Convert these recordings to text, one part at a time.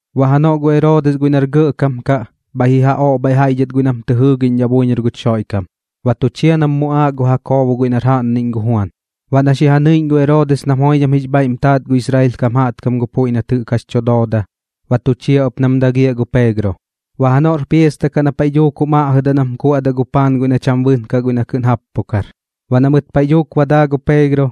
Baꞌ janoꞌ gu Eroodis guiꞌ nar gɇꞌkam kaꞌ bhaiꞌ ji ja oꞌbhaiꞌ jaiꞌ dhɨt guiꞌ nam tɨ jɨɨgiꞌñdhaꞌ buiñor guch Xoiꞌkam, baꞌ tu chia nam muꞌaaꞌ gu Jakoobo guiꞌ nar jaꞌnniꞌñ gu Juan. Baꞌ na xi ja ñɨiꞌñ gu Eroodis nam joidham jix bhaiꞌm taat gu Israel kam jaꞌtkam gu puiꞌ nat jɨꞌk jax tu dooda, ba tu chia ɨp nam dagiaꞌ gu Peegro. Baꞌ janoꞌr piasta kaꞌ na paiꞌ dhuuk jum aꞌjɨdaꞌ nam kuaꞌdaꞌ gu paan guiꞌ na cham bɨnkaꞌ na kɨꞌn jappukar. Baꞌ na mɨt paiꞌ dhuuk ba daa gu Peegro,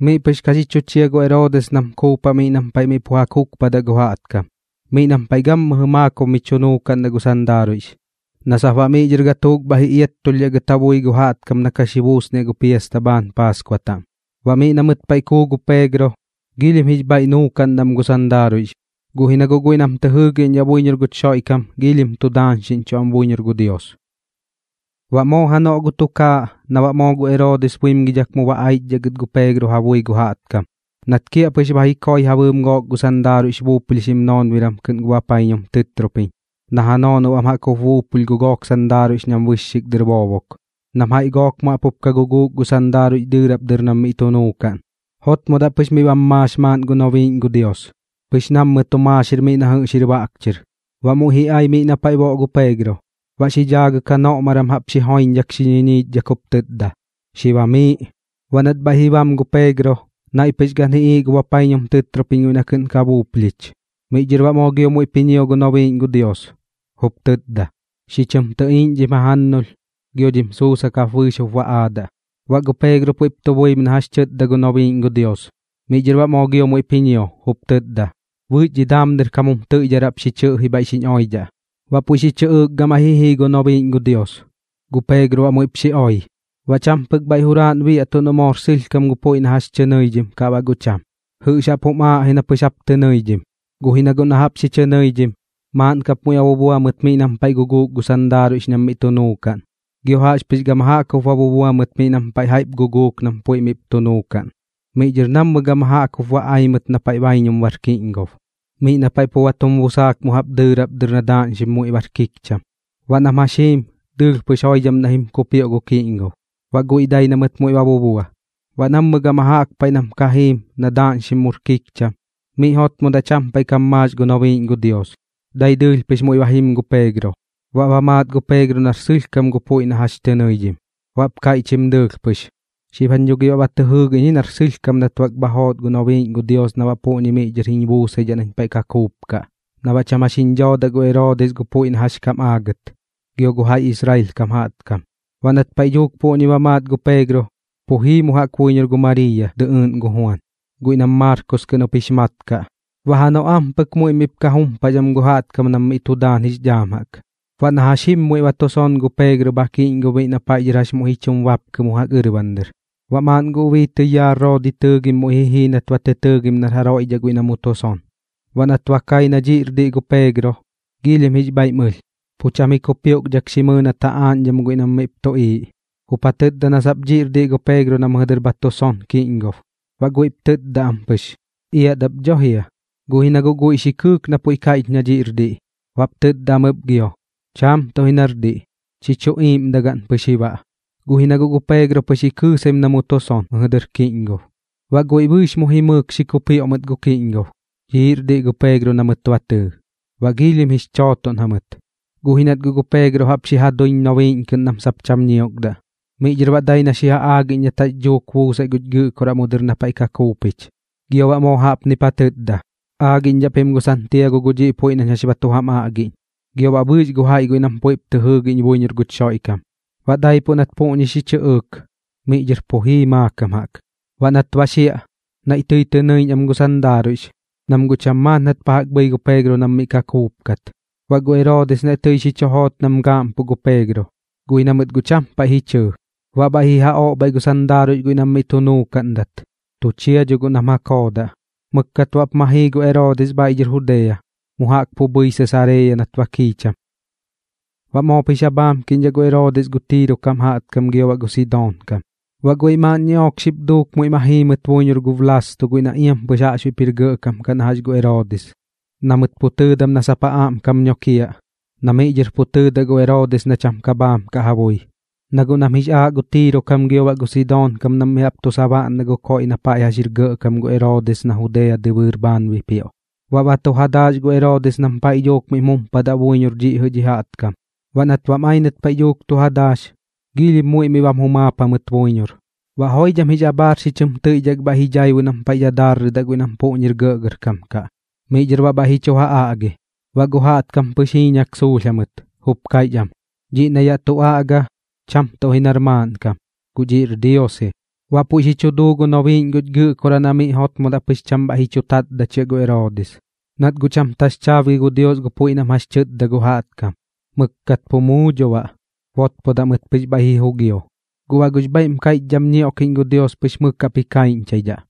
miꞌ pɨx ka xi chu chia gu Eroodis nam kuupaꞌ miꞌ nam paiꞌ miꞌ pu ja kukpadaꞌ gu jaꞌtkam, miꞌ nam paiꞌ gammɨjɨ maakob mi chu nuukaꞌndaꞌ gu sandaaruiꞌx, na sap baꞌ miꞌ dhɨr gatuuk bhaiꞌ ji iattulhdhaꞌ gɨt ja bui gu jaꞌtkam na ka xi buusniaꞌ gu piasta bhaan Paaskua taꞌm. Baꞌ miꞌ na mɨt paiꞌ kuu gu Peegro, giilhim jix bhaiꞌ nuukaꞌn am gu sandaaruiꞌx, guꞌ ji na guꞌ guiꞌ nam tɨ jɨɨgiꞌñdhaꞌ buiñor guch Xoiꞌkam joidham tu daañxiꞌñchuꞌ am buiñor gu Dios. Baꞌ moo janoꞌ gu tukaaꞌ na baꞌ moo gu Eroodis buimgidhak mu ba aichdhaꞌ gɨt gu Peegro ja bui gu jaꞌtkam, nat kiaꞌpɨx ba ji koi ja bɨɨm gook gu sandaaruiꞌx buuplhixim noonbiran kɨꞌn gu bapaiñum tɨtropiñ, na ja noonob am jaꞌk jup buupulh gu gook sandaaruiꞌx nam bɨxxik dɨr boobok, nam jaiꞌ gook mu jaꞌp jup ka guguuk gu sandaaruiꞌx dɨɨrap dɨr nam miꞌ tu nuukaꞌn, jotmodaꞌ pɨx miꞌ bam maax maaꞌn gu nobiiꞌñ gu Dios, pɨx nammɨ tu maaxir miꞌ na jɨꞌx jir baꞌk chɨr. Baꞌ muiꞌ ji ai miꞌ na paiꞌ boꞌ gu Peegro, baꞌ miꞌ xi dhaagɨk janoꞌmgaran jaꞌp xi joiñdhak xi ñiñiichdhak jup tɨtda: ―Xi bamiiꞌ. Baꞌ nat bhaiꞌ ji bam gu Peegro, naiꞌ pɨx gan ji iiꞌ gu bapaiñum tɨtropiñ guiꞌ na kɨꞌn ka buuplhich. Miꞌ dhɨr baꞌ moo gio muiꞌp ji ñio gu nobiiꞌñ gu Dios, jup tɨtda: ―Xi chɨm tɨꞌiiꞌñ dhim jajannulh, gio dhim sussak jap bɨɨx jup ba aadaꞌ. Baꞌ gu Peegro puiꞌp tu buim na jax tɨtda gu nobiiꞌñ gu Dios. Miꞌ dhɨr baꞌ moo gio muiꞌp ji ñio, jup tɨtda: ―Bɨɨx dhi daam dɨr kam jum tɨiꞌdharaꞌp xi chɨꞌji bhaiꞌ xiñ oidhaꞌ. Baꞌ puiꞌ xi chɨꞌɨɨk gamaiꞌ ji jii gu nobiiꞌñ gu Dios, gu Peegro baꞌ muiꞌp xi oi. Baꞌ cham pɨk bhaiꞌ juraaꞌn biaꞌtuꞌ noꞌ moor sɨlhkam gu puiꞌ na jax tɨ nɨidhim kaꞌ baꞌ guꞌ cham, jɨꞌx jaꞌp jum aaꞌ ji na pɨx bap tɨ nɨidhim. Guꞌ ji na guꞌ na jaꞌp xi chɨ nɨidhim, maaꞌn kap muiꞌ ba bubua mɨt miꞌ nam paiꞌ guguuk gu sandaaruiꞌx nam miꞌ tu nuukaꞌn, gio jaꞌxpɨx gama jaꞌk jup ba bubua mɨt nam paiꞌ jaiꞌp guguuk nam puiꞌ miꞌp tu nuukaꞌn. Miꞌ dhɨr nammɨ gama jaꞌk jup ba ai mɨt na paiꞌ baiñum bar kiꞌñgob, miꞌ na paiꞌ pu ba tum busaak mu jaꞌp dɨɨrap dɨr na daaꞌñxim muiꞌ bar kikcham. Baꞌ nam jax jiim, dɨɨlh pɨx joidham naiꞌ jim kupioꞌ gu kiꞌñgob, baꞌ guiꞌ dai na mɨt muiꞌ ba bubua. Baꞌ nammɨ gama jaꞌk paiꞌ nam ka jiim na daaꞌñxim mur kikcham, miꞌ jotmodaꞌ cham paiꞌ kam maax gu nobiiꞌñ gu Dios, dai dɨɨlh pɨx muiꞌ ba jim gu Peegro. Baꞌ ba maat gu Peegro nar sɨlhkam gu puiꞌ na jax tɨ nɨidhim, baꞌp kaiꞌchim dɨɨlh pɨx: ―Xib jañ dho gi baꞌ ba tɨ jɨɨgiꞌñ ji nar sɨlhkam nat bak bha joot gu nobiiꞌñ gu Dios na baꞌ puꞌñi miꞌ dhɨr jiñ buusaidhaꞌ nañ paiꞌ ka kuupkaꞌ, na baꞌ cham jax jiñ dhoodaꞌ gu Eroodis gu puiꞌ na jax kam aagɨt, gio gu jaiꞌ Israel kam jaꞌtkam. Baꞌ nat paiꞌ dhuuk puꞌñi ba maat gu Peegro, pu jii mu jaꞌk buiñor gu Mariiya dɨꞌɨɨꞌn gu Juan, guiꞌ nam Maarkos kɨꞌn jup jix mat kaꞌ. Baꞌ janoꞌ ampɨk muiꞌ miꞌp ka jumpax am gu jaꞌtkam nam miꞌ tu daan jix dhaam jaꞌk. Baꞌ na jax jim muiꞌ ba tu son gu Peegro bha kiꞌñgob miꞌ na paiꞌ dhɨr jax muiꞌ ji chum bapkɨ mu jaꞌk ɨrban dɨr. Baꞌ maaꞌn gu ubii tɨyaa Roodi tɨɨgim muiꞌ ji jii nat ba tɨ tɨɨgim nar jaroiꞌ dhaꞌ guiꞌ na mu tu son. Baꞌ nat ba kai na dhiꞌr diꞌ gu Peegro, giilhim jix bhaiꞌm ɨlh, pu cham ji kupioꞌkdhak xi mɨɨ nat ja aaꞌñdham guiꞌ nam miꞌp tuꞌiiꞌ, jup ja tɨtda na sap dhiꞌr diꞌ gu Peegro na mɨjɨ dɨr bha tu son kiꞌñgob. Baꞌ guiꞌp tɨtda am pɨx: ―¡Iat ap dho jia! Guꞌ ji na guꞌ guiꞌ xi kɨɨk na puiꞌ kaiꞌch na dhiꞌr diꞌ, baꞌp tɨtda am ɨp gio: ―¡Cham tuꞌ ji nar diꞌ! Chi chuꞌ iiꞌmdagaꞌn pɨx ji baꞌ. Guꞌ ji na guꞌ gu Peegro pɨx ji kɨɨsaim na mu tu son mɨjɨ dɨr kiꞌñgob. Baꞌ guiꞌ bɨɨx mu jimɨɨk xi kupioꞌ mɨt gu kiꞌñgob, dhiꞌr diꞌ gu Peegro na mɨt ba tɨɨ. Baꞌ giilhim jix chootoꞌn jamɨt, guꞌ ji nat guꞌ gu Peegro jaꞌp xi ja duiñ nobiiꞌñ kɨꞌn nam sap cham ñiokdaꞌ. Miꞌ dhɨr baꞌ dai na xi ja aagiꞌñ nat jax dhuuk buusai guch Gɨꞌkoraꞌ mu dɨr na paiꞌ ka kuupich. Gio baꞌ moo jaꞌpnip ja tɨtda ɨp: ―Aagiꞌñdhaꞌ pim gu Santiago gu dhiꞌ puiꞌ nañ jax ba tu jam aꞌgiꞌñ, gio baꞌ bɨɨx gu jaiꞌ guiꞌ nam puiꞌp tɨ jɨɨgiꞌñ buiñor guch Xoiꞌkam. Baꞌ daipuꞌ nat puꞌñi xi chɨꞌɨɨk, miꞌ dhɨr pu jii maakam jaꞌk. Baꞌ nat ba xiaꞌ, naiꞌ tɨi tɨ nɨiꞌñ am gu sandaaruiꞌx, nam guꞌ cham maat nat pa jaꞌk bhɨi gu Peegro nam miꞌ ka kuupkat. Baꞌ gu Eroodis naiꞌ tɨi xi chu joot nam gaaꞌmpuꞌ gu Peegro, guꞌ ji na mɨt guꞌ cham paiꞌ ji chɨɨ. Baꞌ bhaiꞌ ji ja oꞌbhaiꞌ gu sandaaruiꞌx guiꞌ nam miꞌ tu nuukaꞌndat, tu chia dho guꞌ nam ja koodaꞌ. Mɨkkat baꞌp ma jii gu Eroodis bhaiꞌ dhɨr Judea, mu jaꞌk pu bhɨi Sesareeya nat ba kiicham. Baꞌ moop jix ja bhaamkiꞌñdhaꞌ gu Eroodis gu Tiiro kam jaꞌtkam gio baꞌ gu Sidoon kam, baꞌ guiꞌ maaꞌn ñiꞌook xip duuk muiꞌ ma jii mɨt buiñor gu Blaasto guiꞌ na iam pɨx jaꞌxbuiꞌp jir gɇꞌkam kaꞌ na jax gu Eroodis, na mɨt pu tɨɨdam na sap ja aꞌmkam nokiaꞌ, na miꞌ dhɨr pu tɨɨdaꞌ gu Eroodis na cham ka bhaam kaꞌ ja bui, na guꞌ nam jix aaꞌ gu Tiiro kam gio gu Sidoon kam nam mi jaꞌp tu sabaꞌndaꞌ gu koiꞌ na paiꞌ jax jir gɇꞌkam gu Eroodis na Judea dɨbɨɨr bhaan bipioꞌ. Baꞌ ba tu ja daax gu Eroodis nam paiꞌ dhuuk miꞌm jumpadaꞌ buiñor dhiꞌ jɨꞌ dhi jaꞌtkam. Baꞌ nat bam ai nat paiꞌ dhuuk tu ja daax, giilhim muiꞌ miꞌ bam jumaap jamɨt buiñor. Baꞌ joidham jix abhaar xi chɨm tɨiꞌdhak bhaiꞌ ji dhaibu nam paiꞌ dadaarrɨdaꞌ guiꞌ nam puꞌñir gɇꞌgɇrkam kaꞌ, miꞌ dhɨr baꞌ bhaiꞌ ji chu ja aꞌgi. Baꞌ gu jaꞌtkam pɨx jiiñak suulh jamɨt, jup kaiꞌch am: ―¡Dhiꞌ na yaꞌ tu aꞌga, cham tuꞌ ji nar maaꞌnkam, guꞌ dhiꞌr dios ji! Baꞌ puiꞌ xi chu duu gu nobiiꞌñ guch Gɨꞌkoraꞌ na miꞌ jotmodaꞌ pɨx cham bhaiꞌ ji chu tatdachia gu Eroodis, nat guꞌ cham taxchaabgi gu Dios gu puiꞌ nam jax tɨtda gu jaꞌtkam. Mɨkkat pu muu dho baꞌ, botpodaꞌ mɨt pɨx bhaiꞌ ji jugio. Guꞌ baꞌ gux bhaiꞌm kaiꞌchdham ñioꞌkiꞌñ gu Dios pɨx mɨk jaꞌp ji kaiꞌñchaidhaꞌ,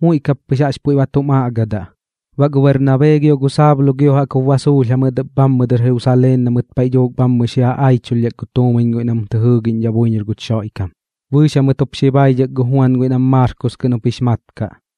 muiꞌ kap pɨx jaꞌx puiꞌ ba tum aꞌgadaꞌ. Baꞌ gu Bernabee gio gu Saulo gio jaꞌk jup ba suulh jamɨt ɨp bhammɨ dɨr Jerusaleen na mɨt paiꞌ dhuuk bhammɨ xi ja aichulhdhak gu tuumiñ guiꞌ nam tɨ jɨɨgiꞌñdhaꞌ buiñor guch Xoiꞌkam. Bɨɨx jamɨt jup xi baidhak gu Juan guiꞌ nam Maarkos kɨꞌn jup jix mat kaꞌ.